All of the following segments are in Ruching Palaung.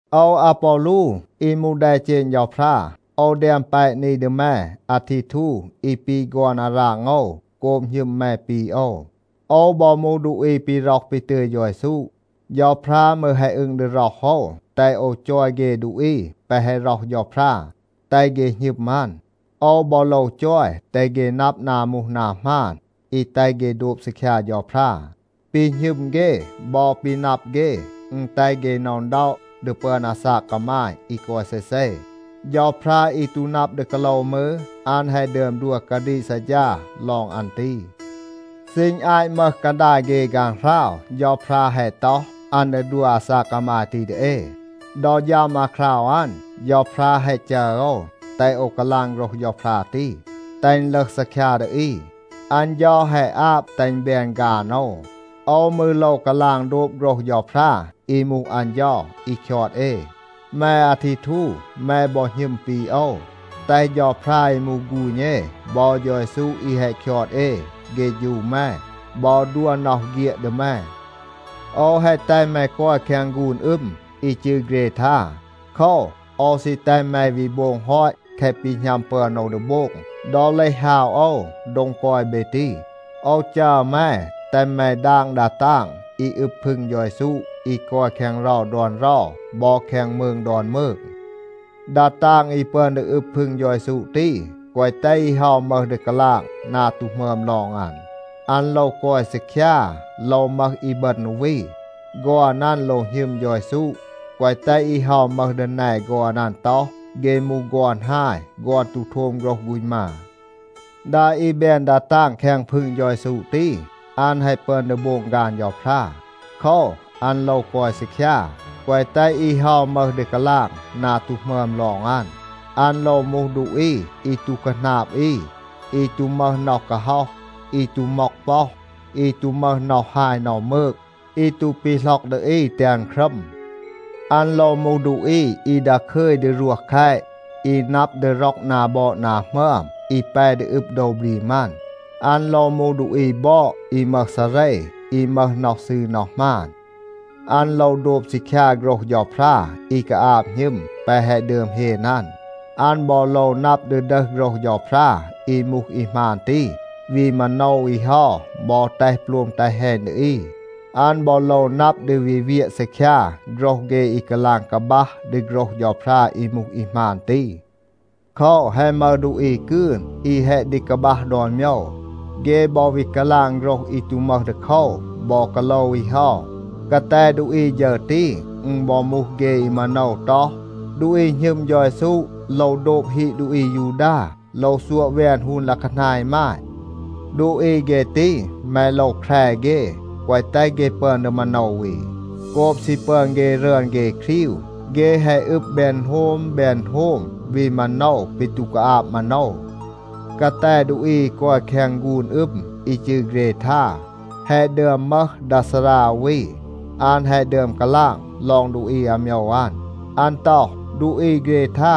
โอว อาปอลู อี มูห แดเจณ เฌาพรา, โอว แดม แปะ นี ดี แม อาทีทู อี ปี ฆอน อาราง โอว โกบ หณึม แม ปี โอว. โอว บอ มูห ดูอี ปี ร็อห ปี ตึย เฌา เยซู. เฌาพรา มืร แฮะ อึง ดี ร็อห โอว, แตห โอว จอย เฆ ดูอี แปะ แฮะ ร็อห เฌาพรา, แตห เฆ หณึม อัน. โอว บอ โลว จอย แตห เฆ นับ นา มูห นา หมาน อี แตห เฆ โดบ ซีคยา เฌาพรา. ปี หณึม เฆ บอ ปี นับ เฆ, อึณ แตห เฆ หน็อะ อึณด็อะ ดี ปึอน อาซาก กามาย อี กอย เซเซ. เฌาพรา อี ตู นับ ดี กาโลว มืร, อัน แฮะ ดึอม ดัว กาดีก ซัดฌา ลอง อัน ตี. ซีณ อาต มึห กาดาย เฆ ฆางหราว เฌาพรา แฮะ ต็อห, อัน ดี ดัว อาซาก กามาย ตี ดี เอ. ดอ ฌัม อาคราว อัน, เฌาพรา แฮะ จัร โอว, แตห โอว กาลาง โฆรห เฌาพรา ตี, แตห อึณ ลึห ซีคยา ดี อี. อัน เฌา แฮะ อาบ แตห อึณ แบน ฆาน โอว. โอว มืร โลว กาลาง โดบ โฆรห เฌาพรา อี มูห อัน เฌา อี คยอด เอ. แม อาทีทู, แม บอ หณึม ปี โอว. แตห เฌาพรา อี มูห ฆูณ เอ บอ เฌา เยซู อี แฮะ คยอด เอ เฆฌู แม บอ ดัว น็อห เฆียด ดี แม. โอว แฮะ แตห แม กอย แคง ฆูน อึม อี จืร เกรทา. โคว, โอว ซี แตห แม วี โบง ฮอต แคะ ปี หณัม ปึอน โอว ดี โบง ดอ เลห ฮาว โอว โดง กอย เบ ตี. โอว จัร แม, แตห แม ดาง ดา ตาง อี อึบ พึง เฌา เยซู อี กอย แคง เรา ดอน เรา บอ แคง มืง ดอน มืง. ดา ตาง อี ปึอน ดี อึบ พึง เฌา เยซู ตี, แกวะ แตห อี เฮา มึห ดี กาลาง นา ตู หมึอม ลอง อัน. อัน โลว กอย ซีคยา, โลว มึห อีบึณ อู วี. ฆอน อัน โลว หณึม เฌา เยซู, แกวะ แตห อี เฮา มึห ดี แน ฆอน อัน ต็อห, เฆ มูห ฆอน ฮาย, ฆอน ตู โทม โฆรห ฆูณ มา. ดา อี แบน ดา ตาง แคง พึง เฌา เยซู ตี, อัน แฮะ ปึอน ดี โบง ฆาน เฌาพรา. โคว, อัน โลว กอย ซีคยา. แกวะ แตห อี เฮา มึห ดี กาลาง นา ตู หมึอม ลอง อัน. อัน โลว มูห ดูอี อี ตู คาหนาบ อี, อี ตู มึห น็อห กาฮ็อห, อี ตู ม็อก ป็อห, อี ตู มึห น็อห ฮาย น็อห มืก, อี ตู ปีหล็อก ดี อี แตห อัน ครัม. อัน โลว มูห ดูอี อี ดาคึย ดี รวห แคต, อี นับ ดี ร็อก นา บอด นา หมึอม, อี แป ดี อึบ โดว บรีม อัน. อัน โลว มูห ดูอี บอด อี มึห ซาเร, อี มึห น็อห ซืร น็อห หมาน. อัน โลว โดบ ซีคยา โฆรห เฌาพรา อี กาอาบ หณึม แปะ แฮะ ดึอม เฮน อัน. อัน บอ โลว นับ ดี ดึห โฆรห เฌาพรา อี มูห อี หมาน ตี, วี มาโนว อี เฮา บอ แตห โปลม แตห แฮณ ดี อี. อัน บอ โลว นับ ดี วี เวียะ ซีคยา โฆรห เฆ อี กาลาง กาบัห ดี โฆรห เฌาพรา อี มูห อี หมาน ตี. โคว, แฮะ มึห ดูอี กืน อี แฮะ กาบัห ดี ดอน โมยว. เฆ บอ วี กาลาง โฆรห อี ตู มึห ดีโคว บอ กาโลว อี เฮา. กาแต ดูอี ฌึร ตี, อึณ บอ มูห เฆ อี มาโนว ต็อห, ดูอี หณึม เฌา เยซู โลว โดบ ฮีด ดูอี อายูดา, โลว ซัวะ แวน ฮูน ลัะคานา อีมาย. ดูอี เฆ ตี, แม โลว แคร เฆ, แกวะ แตห เฆ ปึอน ดี มาโนว อี. โกบ ซี ปึอน เฆ รึอน เฆ ครีว, เฆ แฮะ อึบ แบน อึณโฮม แบน อึณโฮม, วี มาโนว ปี ตู กาอาบ มาโนว. กาแต ดูอี อี กอย แคง ฆูน อึม อี จืร เกรทา, แฮะ ดึอม มึห ดา ซารา อู วี, อัน แฮะ ดึอม กาลาง ลอง ดูอี อาโมยว อัน. อัน ต็อห, “ดูอี เกรทา,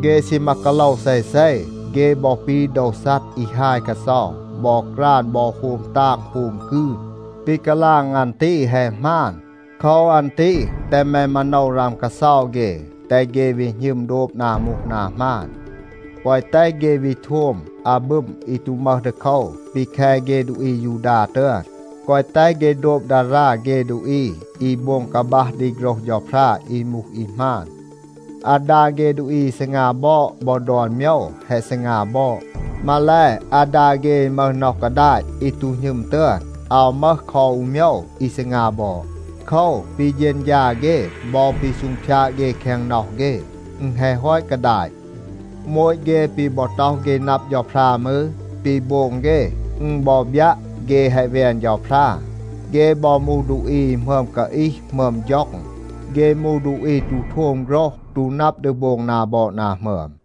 เฆ ซีมา กาโลว เซเซ. เฆ บอ ปี โดว ซัด อี ฮาย กาเซา บอ กราน บอ โฮม ตาง โฮม กืน.” ปี กาลาง อัน ตี, แฮะ หมาน. โคว อัน ตี แตห แม มาโนว ราม กาเซา เฆ, แตห เฆ วี หณึม โดบ นา มูห นา หมาน, แกวะ แตห เฆ วี โทม อาบึม อี ตู มึห ดีโคว ปี แค เฆ ดูอี อายูดา ตึอน. แกวะ แตห เฆ โดบ ดารา เฆ ดูอี อี โบง กาบัห ดี โฆรห เฌาพรา อี มูห อี หมาน. อาดา เฆ ดูอี อี ซีงา บอด บอ ดอน โมยว แฮะ ซีงา บอด. มาแล, อาดา เฆ อี มึห น็อห กาดาต อี ตู หณึม ตึอน อาว มึห คอ อู โมยว อี ซีงา บอด. โคว, ปี เฌณฌา เฆ บอ ปี ซูงพยาด เฆ แคง น็อห เฆ, อึณ แฮะ ฮอต กาดาต. โมต เฆ ปี บอ ต็อห เฆ นับ เฌาพรา มืร, ปี โบง เฆ อึณ บอ บยัะ, เฆ แฮะ แวน เฌาพรา. เฆ บอ มูห ดูอี อี หมึอม กาอีห หมึอม ฌ็อง. เฆ มูห ดูอี ตู โทม โฆรห, ตู นับ ดี โบง นา บอด นา หมึอม.